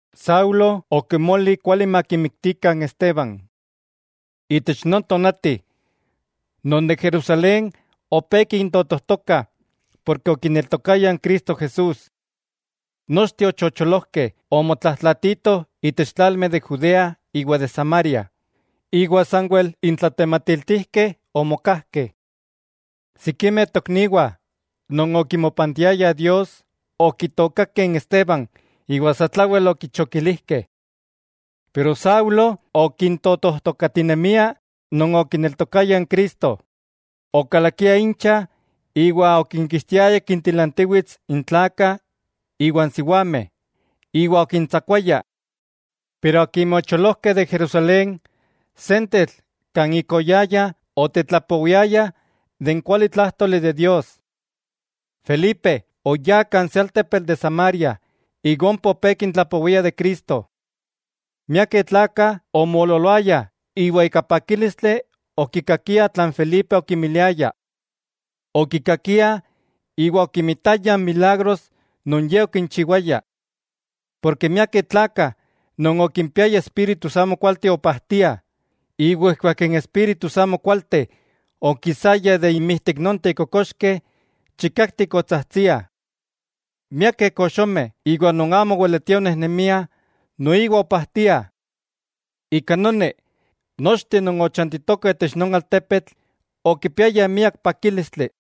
Saulo okimoli kuali makimiktikah n Esteban. Itech non tonati, non de Jerusalén opé kintotojtokah porke okineltokayah Cristo Jesús. Nochteh ochocholojkeh omotlajtlaatitoh itech tlalmeh de Judea iwa de Samaria, iwa sanwel n tlatematiltijkeh omokajkeh. Sikimeh tokniwah non okimopantiayah Dios, okitookakeh n Esteban iwa satlawel okichokilijkeh. Pero Saulo okintotojtokatinemia non okineltokayah n Cristo, okalakia incha iwa okinkixtiaya kintilantiwits n tlakah iwa n siwameh, iwa okintsakuaya. Akimeh ocholojkeh de Jerusalén, sentetl kan ik oyayah otetlapowiayah de n kualitlájtoli de Dios. Felipe, oyá kan se altepetl de Samaria iwa ompa opé kintlapowia de Cristo. Miakeh tlakah omoololoayah iwa ika pakílistli okikakiah tlan Felipe okinmiliaya. Okikakiah iwa okimitayah n milagros non ye okinchiwaya. Porke miakeh tlakah non okimpiayah espíritus amokualteh opajtiah, iwa ijkuak n espíritus amokualteh okisayah inmijtik nonteh kokoxkeh, chikaktik otsajtsiah. Miakeh koxomeh iwa non amo oweletiah onejnemiah noiwa opajtiah. Ika noni, nochteh non ochantitokah itech non altepetl okipiayah miak pakílistli.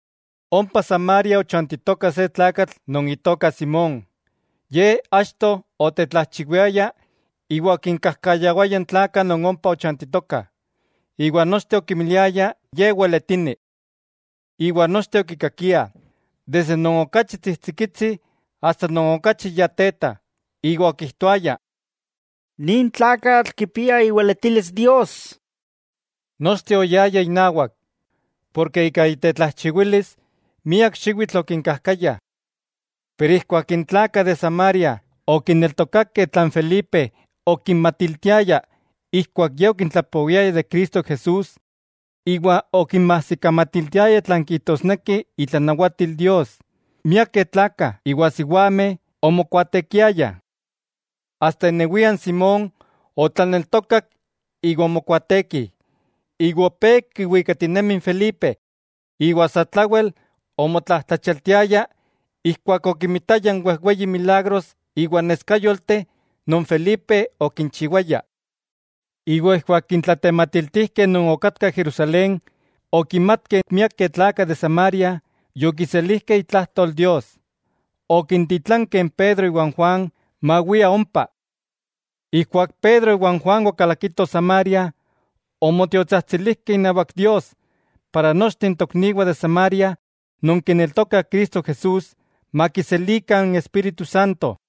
Ompa Samaria ochantitoka se tlakatl non itoka Simón, ye achto otetlajchiwiaya iwa okinkajkayawaya n tlakah non ompa ochantitokah, iwa nochteh okimiliaya ye weletini. Iwa nochteh okikakiah, non okachi tsijtsikitsi asta non okachi ya teta, iwa okijtoayah: —Nin tlakatl kipia iweletilis Dios. Nochteh oyayah inawak, porke ika itetlajchiwilis miak xiwitl okinkajkaya. Pero ijkuak n tlakah de Samaria okineltokakeh tlan Felipe okinmatiltiaya ijkuak ye okintlapowiaya de Cristo Jesús iwa okinmajsikamatiltiaya tlan kijtosneki itlanawatil Dios, miakeh tlakah iwa siwameh omokuaatekiayah. Asta inewia n Simón otlaneltokak iwa omokuaateki, iwa opé kiwikatinemi n Felipe iwa satlawel omotlajtlachialtiaya ijkuak okimitaya n wejweyi milagros iwa neskayolteh non Felipe okinchiwaya. Iwa ijkuak n tlatematiltijkeh non okatkah Jerusalén okimatkeh miakeh tlakah de Samaria yokiselijkeh itlajtol Dios, okititlankeh n Pedro iwa Juan mawiah ompa. Ijkuak Pedro iwa Juan okalakitoh Samaria, omotiotsajtsilijkeh inawak Dios para nochteh n tokniwah de Samaria non kineltokah Cristo Jesús, makiselikah n Espíritu Santo.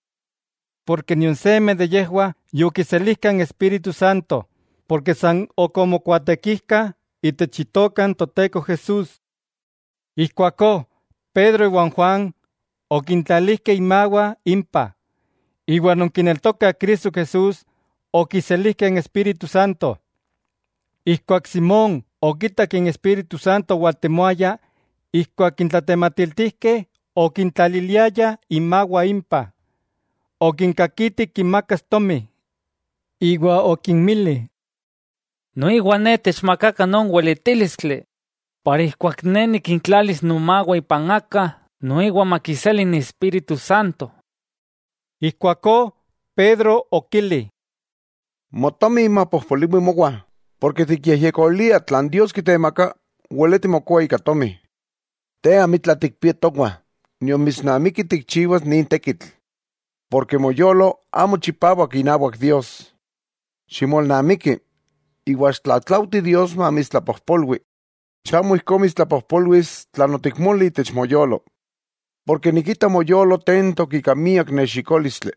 Porke nion seme de yejwah yokiselijka n Espíritu Santo, porke san ok omokuatekijkah itech Itoka n Toteko Jesús. Ijkuakó Pedro iwa n Juan okintlalijkeh inmawah impah, iwa non kineltokah Cristo Jesús, okiselijkeh n Espíritu Santo. Ijkuak Simón okitak n Espíritu Santo owaltemoaya ijkuak n tlatematiltijkeh okintlaliliayah inmawah impah, okinkakiti kinmakas tomi, iwa okinmili: —Noiwa ne techmakakah non weletílistli, para ijkuak ne nikintlalis nomawah ipan aka noiwa makiseli n Espíritu Santo. Ijkuakó Pedro okili: —Motomi mapojpoliwi mowa, ken tikyejyekolia tlan Dios kitemaka weleti mokoa ika tomi. Te amitla tikpia towah nion mitsnamiki tikchiwas nin tekitl, porke moyolo amo chipawak inawak Dios. Ximolnamiki, iwa xiktlatlaujti Dios mamitstlapojpolwi, chamo ijkó mitstlapojpolwilis tlan otikmoli itech moyolo. Porke nikita moyolo tentok ika miak nexikólistli,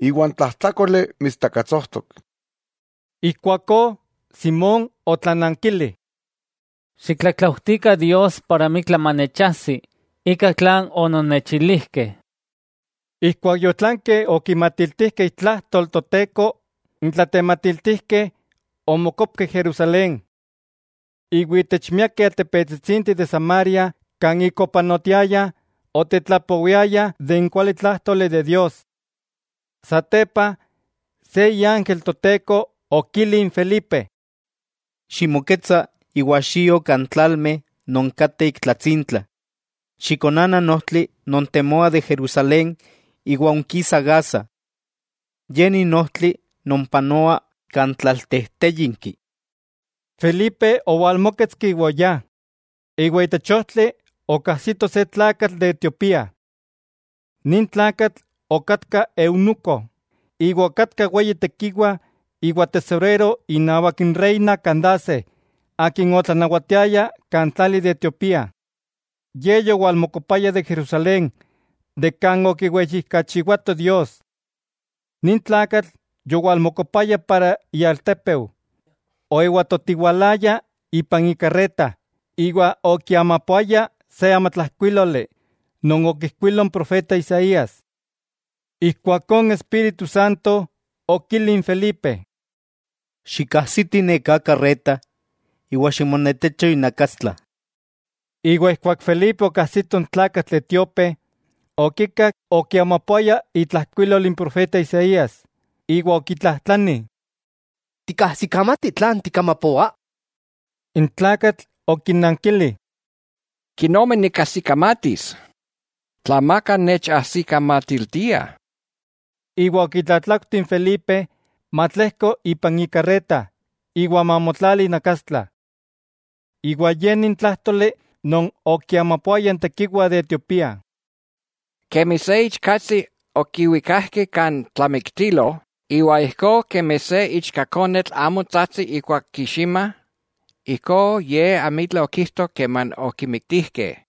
iwa n tlajtlákoli mitstakatsojtok. Ijkuakó Simón otlanankili: —Xiktlatlautikah Dios amitla manechajsi ika tlan ononnechilijkeh. Ijkuak yotlankeh okinmatiltijkeh itlajtol Toteko, n tlatematiltijkeh omokopkeh Jerusalén. Iwa itech miakeh altepetsitsinteh de Samaria kan ik opanotiayah, otetlapowiayah de n kualitlájtoli de Dios. Satepa se iángel n Toteko okili n Felipe: —Ximoketsa iwa xio kan tlalmeh non kateh ik tlatsintla, xikonana n ojtli non temoa de Jerusalén iwa onkisa Gaza. Ye ni n ojtli non panoa kan tlaltejtéyinki. Felipe owalmóketski iwa oyá, iwa itech ojtli okajsito se tlakatl de Etiopía. Nin tlakatl okatka eunuco iwa okatka weyi tekiwa iwa tesorero inawak n reina Kandace akin otlanawatiaya kan tlali de Etiopía. Ye yowalmokopaya de Jerusalén kan okiweyijkachiwato Dios. Nin tlakatl yowalmokopaya kan ialtépeu, oewatotiwalaya ipan ikarreta iwa okiamapoaya se amatlajkuíloli non okijkuilo n profeta Isaías. Ijkuakó n Espíritu Santo okili n Felipe: —Xikajsiti neká karreta iwa ximonetecho inakastla. Ijkuak Felipe okajsito n tlakatl etíope, okikak okiamapoaya itlajkuilol n profeta Isaías, iwa okitlajtlani: —¿Tikajsikamati tlan tikamapoa? N tlakatl okinankili: —¿Kenomi nikajsikamatis, tla amaka nechajsikamatiltia? Iwa okitlatlaujti n Felipe matlejko ipan ikarreta iwa mamotlali inakastla. Iwa ye ni n tlájtoli non okiamapoaya n tekiwa de Etiopía: Kemi se ichkatsi okiwikakeh kan tlamiktilo; iwa ijkó kemi se ichkakonetl amo tsajtsi ijkuak kiximah, ijkó Ye amitla okijto keman okimiktijkeh.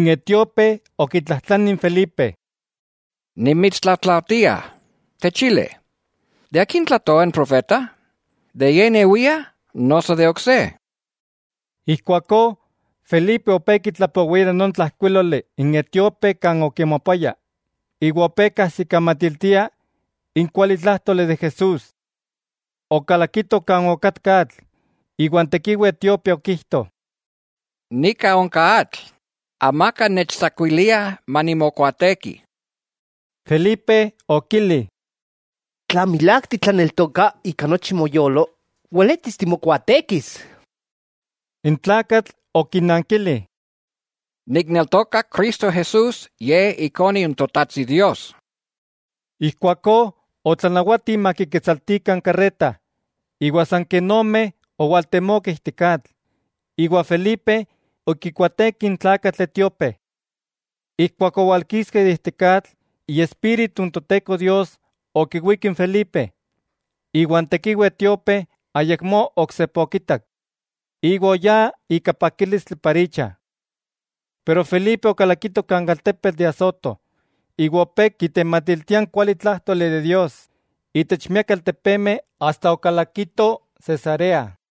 N etíope okitlajtlani n Felipe: —Nimitstlatlaujtia, techili, ¿de akin tlajtoa n profeta, de ye inewia noso de ok se? Ijkuakó Felipe opé kitlapowia de non tlajkuíloli n etíope kan okiamapoaya, iwa opé kajsikamatiltia n kualitlájtoli de Jesús. Okalakitoh kan okatka atl, iwa n tekiwa etíope okijto: —Nika onka atl, amaka nechtsakuilia manimokuaateki. Felipe okili: —Tla milák titlaneltoka ika nochi moyolo, weletis timokuaatekis. N tlakatl okinankili: —Nikneltoka Cristo Jesús, Ye Ikone n Totajtsi Dios. Ijkuakó otlanawati makiketsaltikah n karreta, iwa san ken ome otemokeh ijtik atl, iwa Felipe okikuaateki n tlakatl etíope. Ijkuak owalkiskeh ijtik atl, Iespíritu n Toteko Dios okiwík n Felipe, iwa n tekiwa etíope ayakmó oksepa okitak; iwa oyá icha ika pakílistli. Pero Felipe okalakito kan altepetl de Azoto, iwa opé kitematiltia n kualitlájtoli de Dios itech miakeh altepemeh asta okalakito Cesarea.